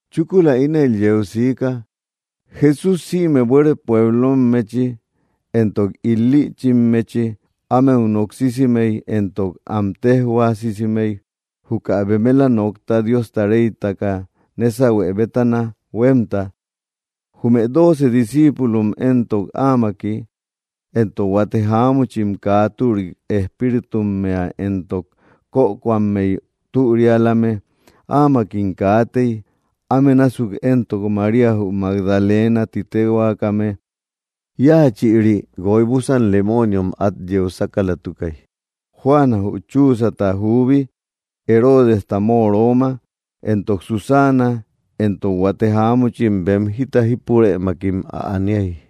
Chúkula ínel yeu siika. Jesús sïme buere pueblommechi éntok il‑lïchimmechi ámeu noksisimey éntok am téjhuaasimey juka bemela nokta Diosta reytaka nésahue bétana huémta. Jume dooce discíipulom éntok áamaki. Éntok huate jáamuchim kaa türi espíritummea éntok kökoammey türialame áamakim kaatey, áme násuk entok María jü Magdalena ti téhuaakame, íachïri guoy búsan lemooniom át yeu sákalatukay; Juana, jü Chuuzata juubi, Heroodesta móoroma, éntok Susana, éntok huate jáamuchim bem jita jípurëmakim ä aniay.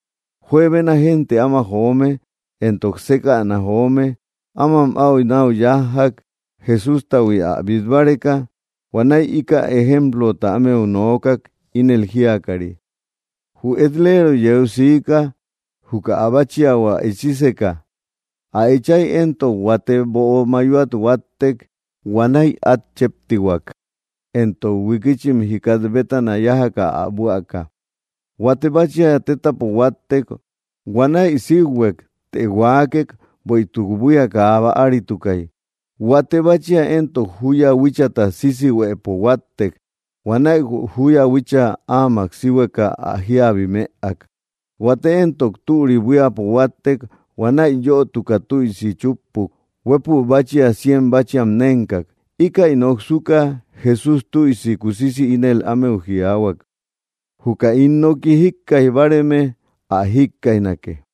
Juebena génte áma joome, éntok sékäna joome, áma áu náu yájjak, Jesústahui ä bít báreka, huanäi íkäi ejemplota ámeu nookak, ínel jíakari: —Jü et‑leero yeu siika juka ä báchiahua echíseka. Ä echay éntok, huate böo mayoat huáttek huanäi át chéptihuak, éntok huikichim jikat bétana yájaka ä buäka. Huate báchia tétapo huáttek. Huanäi síuhuek, të huaakek, bueïtuk buía kaa bäaritukay. Huate báchia éntok júya huíchata sisihuëpo huáttek. Huanäi jü júya huícha áamak síhueka ä jíabi mëak. Huate éntok türi buíapo huáttek. Huanäi yötuka tüisi chúppuk, huépü báchia cien báchiam nénkak. Íkäi noksuka, Jesús tüisi kusisi ínel ámeu jiaahuak: —¡Jükä ín nooki jíkkaij báareme ä jikkaijnake!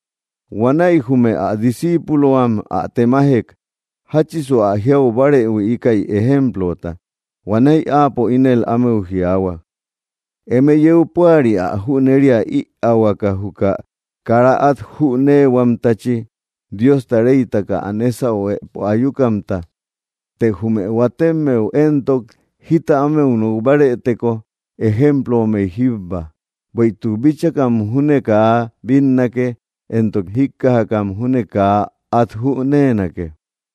Huanäi jume ä disciipulohuam ä temajek: —¿Jáchisu ä jiau báarehui ikäy ejemplota? Huanäi áapo ínel ámeu jiaahua: —Eme yeu púari ä jüneria ïaahuaka juka kara át jüneehuamtachi Diosta reytaka ä nésahuepo ayukamta. Të jume huatemmeu éntok, jita ámeu nok bárëteko, ejemplommey jíbba. Bueïtuk bíchakam júne kaa bínnake, éntok jíkkajakam júne kaa át jüneenake.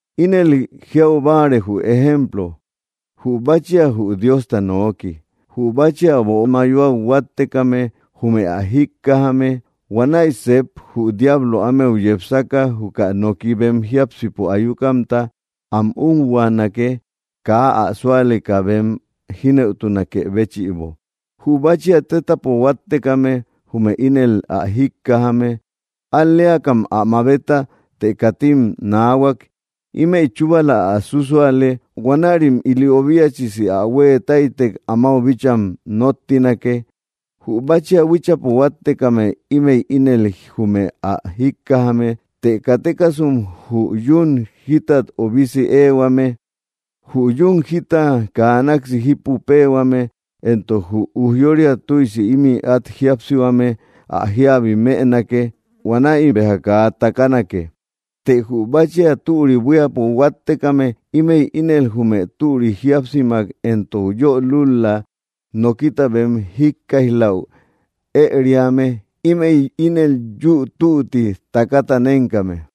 ’Ínel jiau báare, jü ejemplo: Jü báchia jü Diosta nooki; jü báchia böo mayoat huáttekame jume ä jíkkajame, huanäi sep jü diablo ámeu yepsaka, juka noki bem jiápsipo ayukamta am úhuaanake kaa ä súaleka bem jínëutunakë béchïbo. Jü báchia tétapo huáttekame, jume ínel ä jíkkajame. Al‑leakam ä mabeta, të katim naahuak; ímëi chúbala ä sússuale, huanärim ili obiachisi ä huée táytek amáu bícham nóttinake. Jü báchia huíchapo huáttekame ímëi ínel jume ä jíkkajame të katekasum jü yún jitat obisi éehuame, jü yún jita kaa naksi jípu péehuame éntok jü ujyória tüisi ímï át jíapsihuame ä jíabi mënake, huanäi béjam kaa takanake. Të jü báchia türi buíapo huáttekame ímëi ínel jume türi jíapsimak éntok yö lúl‑la nokita bem jíkkaij‑läu ëeriame, ímëi ínel yü tutti takata nénkame.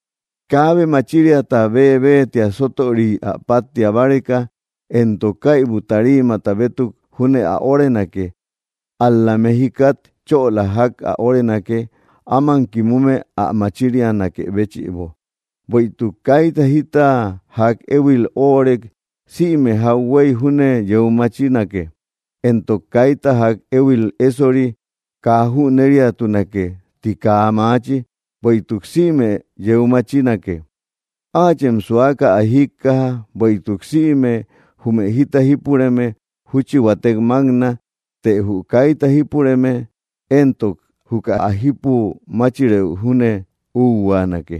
’Kaabe machiriata bébeetia sótöriy ä páttia báreka, éntok kaibu tariimata bétuk júne ä órenake; ál‑la metjikat chöla ják ä órenake, áman kimume ä machirianakë béchïbo. Bueïtuk kaita jita ják éhuil óorek sïme jauhuey júne yeu machinake; éntok kaita ják éhuil ésori, kaa jüneriatunake ti kaa maachi, bueïtuk sïme yeu machinake. ’Áachem suaka, ä jíkkaja; bueïtuk sïme jume jita jípureme, júchi huatek mákna, të jü kaita jípureme, éntok juka ä jípu máchirëu júne úhuaana.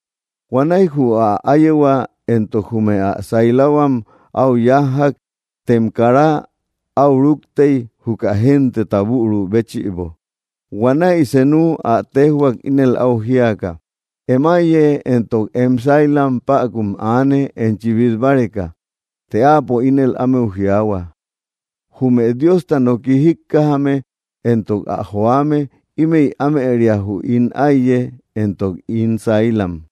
Huanäi jü ä áyehua éntok jume ä sailahuam áu yájjak, tem karam áu rúktey juka genteta büru béchïbo. Huanäi senu ä téjhuak, ínel áu jíaka: —Em áiye éntok em sailam päkum aane enchi bít báreka. Të áapo ínel ámeu jiaahua: —Jume Diosta noki jíkkajame éntok ä joame, ímëi ámëria jü ín áiye éntok ín sailam.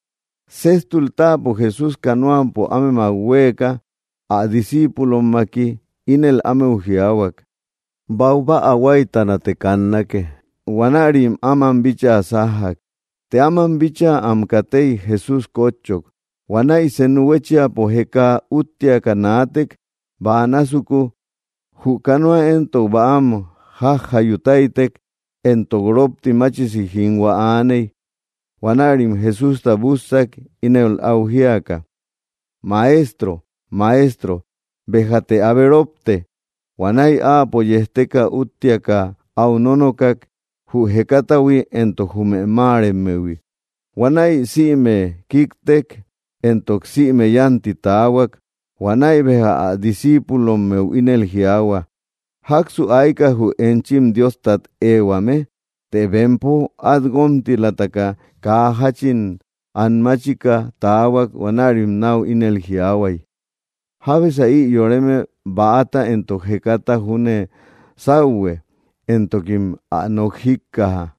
Séjtul táapo Jesús canoapo ámemak huéeka ä discíipulommaki, ínel ámeu jiaahuak: —Baubäa huáytanate kannake. Huanärim áman bíchaa sájjak. Të áman bíchaa am katey, Jesús kótchok. Huanäi senu huéchiapo jeka úttiaka naatek, bäa násuku. Jü canoa éntok bäam jajjayu táytek, éntok rópti machisi jínhua aaney. Huanärim Jesústa bússak, ínel áu jíaka: —¡Maestro! ¡Maestro! ¡Béjate abe rópte! Huanäi áapo yejteka, úttiaka áu nónokak jü jekatahui éntok jume máaremmehui; huanäi sïme kiktek entok sïme yánti taahua. Huanäi béja ä discíipulommeu ínel jiaahua: —¿Jáksu ayka jü enchim Diostat éhuame? Të bempo, at guómtilataka, kaa jáchin an máchika taahuak huanärim náu ínel jiaahuay: —¿Jábesa ï yoreme, bäata éntok jekata júne sáuhue, éntokim ä nok jíkkaja?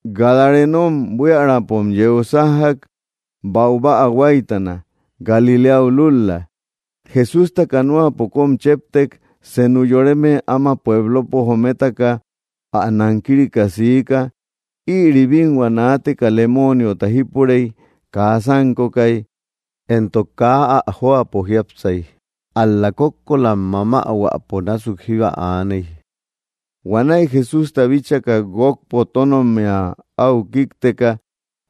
Gadarenom buiärapom yeu yájjak, baubäa huáytana, Galiléau lul‑la. Jesústa canoapo kóm chéptek, senu yoreme áma pueblopo jometaka ä nankirika siika. Ïri bínhua naateka lemooniota jípurey. Kaa sánkokay, éntok kaa ä jóapo jiápsay; ál‑la kókkolam mamähuäpo násuk jíba aaney. Huanäi Jesústa bíchaka, guókpo tónommia áu kíkteka,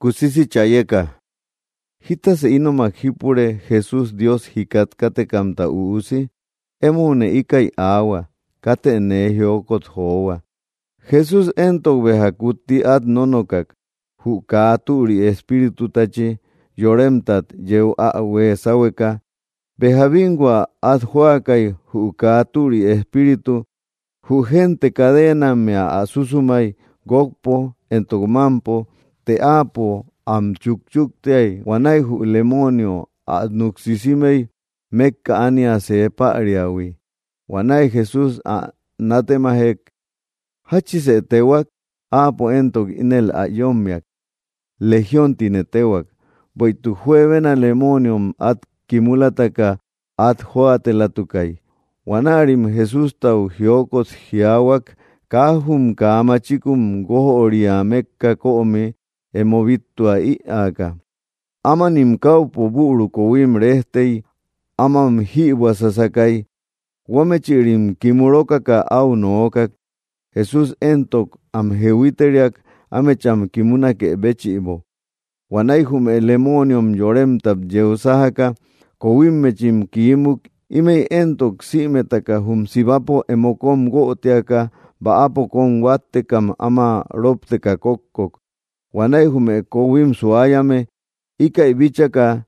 kusisi chayeka: —¿Jítasë ínomak jípure, Jesús, Dios jikat kátekamta Üusi? Emoune íkäi aahua, katë nee jiokot johua. Jesús éntok béja kutti át nónokak jü kaa türi espíritutachi yoremtat yeu ä huée sáhueka. Béja bínhua át jóakay jü kaa türi espíritu; jü gente cadeenammea ä susumay guókpo éntok mámpo; të áapo am chúkchuktiay huanäi jü lemoonio ä núk sisimey mékka ánia see päriahui. Huanäi Jesús ä nátemajek: —¿Jáchisë téhuak? Áapo éntok ínel ä yómmiak: —Legión tine téhuak. Bueïtuk juebena lemooniom át kimulataka át jóatelatukay. Huanärim Jesústau jiokot jiaahuak, kaa jum kaa machikun guójöria mékka kömi emo bíttua ïaaka. Ámanim káupo büru koohuim rejtey ámam jïbuäsasakay, huamechïrim kimu rókaka áu nookak; Jesús éntok am jehuiteriak ámecham kimunakë béchïbo. Huanäi jume lemooniom yoremtat yeu sájaka kohuimmechim kimuk ímëi éntok sïmetaka jum sibapo emo kóm guötiaka bäapo kóm huáttekam, áma ropteka kókkok. Huanäi jume kohuim suayame, íkäi bíchaka,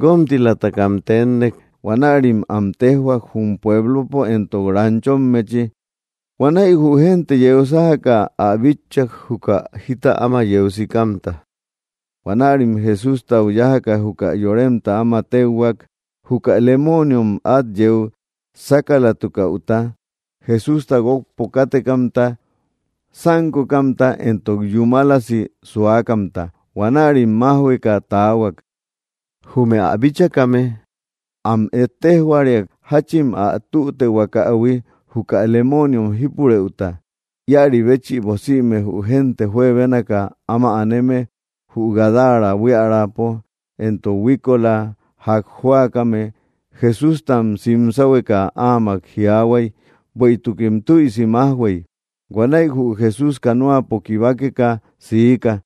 guómtilamtaka tennek huanärim am téjhuak jum pueblopo éntok ranchommechi. Huanäi jü génte yeu sájaka ä bitchak juka jita áma yeu sikamta. Huanärim Jesústau yájaka, juka yoremta áma téuhuak juka lemooniom át yeu sákalatukäuta, Jesústa guókpo kátekamta, sánkokamta éntok yúmalasi suakamta. Huanärim májhueka taahuak. Jume ä bíchakame, am ejtejhuariak jáchin ä tütehuakähui juka lemooniom jípurëuta. Íäribéchïbo, sïme jü génte juebénaka áma aneme jü Gadara buiärapo éntok huíkola ják jóakame, Jesústam sim sáhueka áamak jiaahuay, bueïtukim tüisi májhuey. Huanäi jü Jesús, canoapo kibakeka, siika.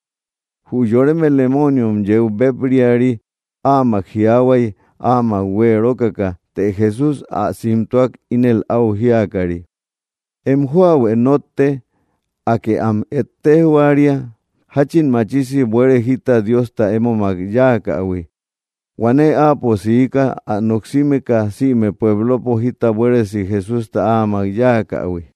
Jü yoreme lemooniom yeu béb‑riari áamak jiaahuay, áamak huée rókaka. Të Jesús ä simtuak, ínel áu jíakari: —Em jóahuë nótte; Akë am ejtejhuaria jáchin machisi buere jita Diosta émomak yáakähui. Huanäi áapo siika, ä noksimeka sïme pueblopo jita buéresi Jesústa áamak yáakähui.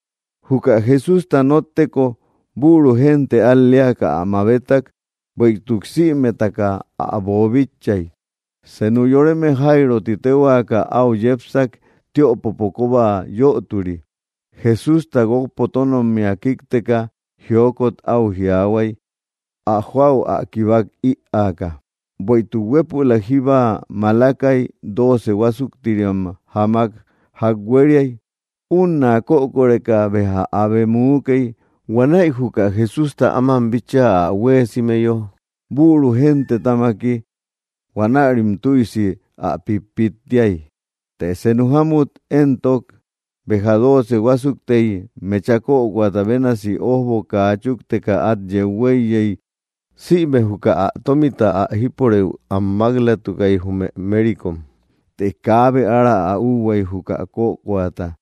Juka Jesústa nótteko, büru génte al‑leaka ä mabetak, bueïtuk sïmetaka ä boobíchaïhuiy. Senu yoreme Jairo ti téhuaaka áu yepsak, tiöpopo kóba yöturi. Jesústa guókpo tónommia kíkteka, jiokot áu jiaahuay ä jóau ä kibak ïaaka. Bueïtuk huépülak jíba malakay, dooce huásuktiriam jamak ják huériay; únna kökoreka béja abe muukey. Huanäi juka Jesústa áman bíchaa ä huéesimeyo, büru gentetamaki huanärim tüisi ä pítpittiay. Të senu jámut éntok béja dooce huásuktey mecha kökoata bénasi ójbo kaa chúkteka át huéiyey sïme juka ä tómita ä jípurëu am mák‑latukay jume mérikom, të kaabe ára ä úhuay juka kökoata.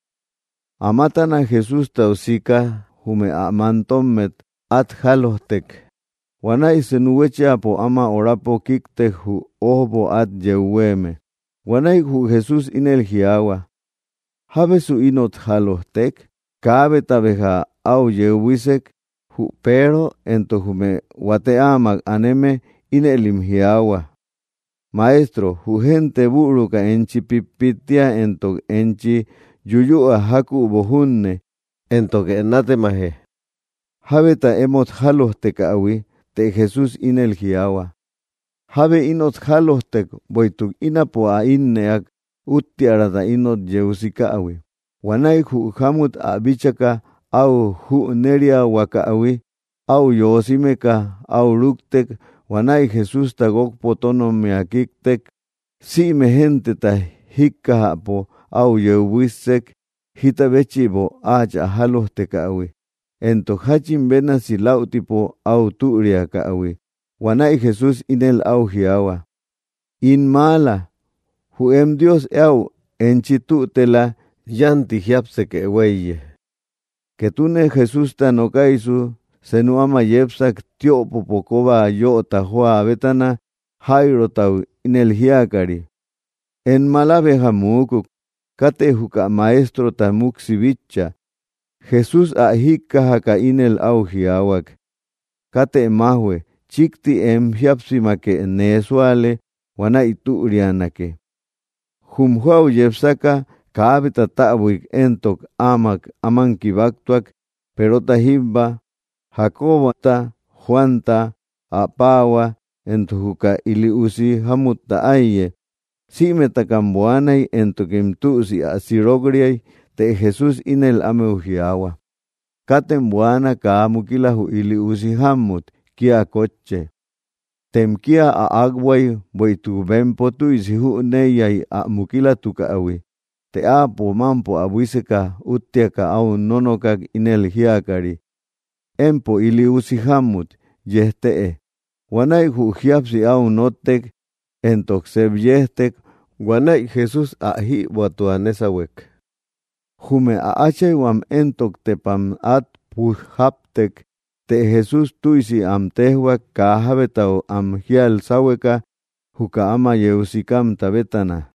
Amatana Jesústau sika jume ä mantommet át jálojtek, huanäi senu huéchiapo áma horapo kíktek jü ójbo át yeu huéeme. Huanäi jü Jesús ínel jiaahua: —¿Jábesu inot jálojtek? Kaabeta béja áu yeu buísek, jü Peero éntok jume huate áamak aneme ínëlim jiaahua: —Maestro, jü génte büruka enchi pítpittia éntok enchi yuyüa jákübo junne, éntoke nátemaje: “¿Jábeta emót jálojtekähui?” Të Jesús ínel jiaahua: —Jábe inot jálojtek, bueïtuk ínapo ä ínnëak, úttiärata inot yeu sikähui. Huanäi jü jámut, ä bíchaka áu jüneriahuakähui, áu yoosimeka áu rúktek huanäi Jesústa guókpo tónommia kíktek. Sïme genteta jíkkajäpo áu yeu buíssek jita béchïbo áachä jálojtekähui, éntok jáchin bénasi läutipo áu türiakähui. Huanäi Jesús ínel áu jiaahua: —In maala, jü em Dios eäu enchi tütela. Yánti jiápsekë huéiye. Ketune Jesústa nokaysu, senu áma yepsak, tiöpopo kóba yöta jóa bétana, Jairotau ínel jíakari: —Em mala béja muukuk; katë juka Maestrota múksi bitcha. Jesús ä jíkkajaka ínel áu jiaahuak: —Katë májhue; chíkti em jíapsimake nee súale, huanäi türianake. Jum jóau yepsaka, kaabeta täbuik éntok áamak áman kibaktuak, Perota jíbba, Jacobota, Juanta, ä paahua, éntok juka ili usi jámutta áiye. Sïmetakam buaanay, éntokim tüisi ä sirok‑riay. Të Jesús ínel ámeu jiaahua: —Katem buaana. Kaa mukila jü ili usi jámmut, kía kótche. Tem kía ä akbuay, bueïtuk bempo tüisi jüneiyay ä mukilatukähui. Të áapo, mámpo ä buíseka úttiaka áu nónokak ínel jíakari: —Empo ili usi jámmut, yejtëe. Huanäi jü jíapsi áu nóttek, éntok sep yejtek; huanäi Jesús ä jïbuätua nésahuek. Jume ä áchayhuam éntok tepam át puj jáptek; të Jesús tüisi am téjhuak kaa jábetau am jíal sáhueka juka áma yeu sikamta bétana.